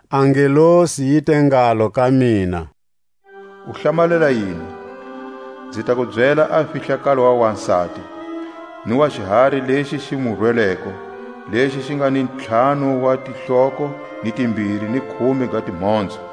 A ngelosi yi te ngalo ka mina: U hlamalela yini? Nzi ta ku byela a fihlakalo wa wasati, ni wa xihari lexi xi mu rweleko, lexi xi nga ni ntlhanu wa tihloko ni timbiri ni khume ga timhonzo.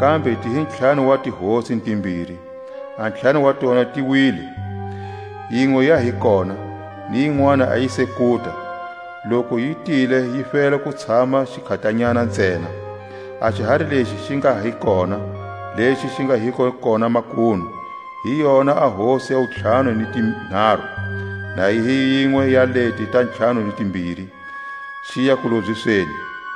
Kambe ti hi ntlhanu wa tihosi ni timbiri: a ntlhanu wa tona ti wile, yinwe ya hi kona, ni yinwani a yi se kuta; loku yi tile yi fela ku tshama xikhatanyana ntsena. A xihari lexi xi nga hi kona, lexi xi nga hiko kona makunu, hi yona a hosi ya wuntlhanu ni tinharu, na yi hi yinwe ya leti ta ntlhanu ni timbiri; xiya kulobyisweni.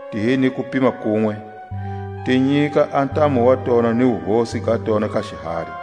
Ti hi ni kupima kunwe, ti nyika a ntamu wa tona ni wuhosi ga tona ka xihari.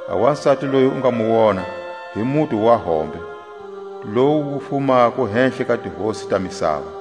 A wasati loyi u nga mu wona hi muti wa hombe, lowu wu fumako hehla ka tihosi ta misava.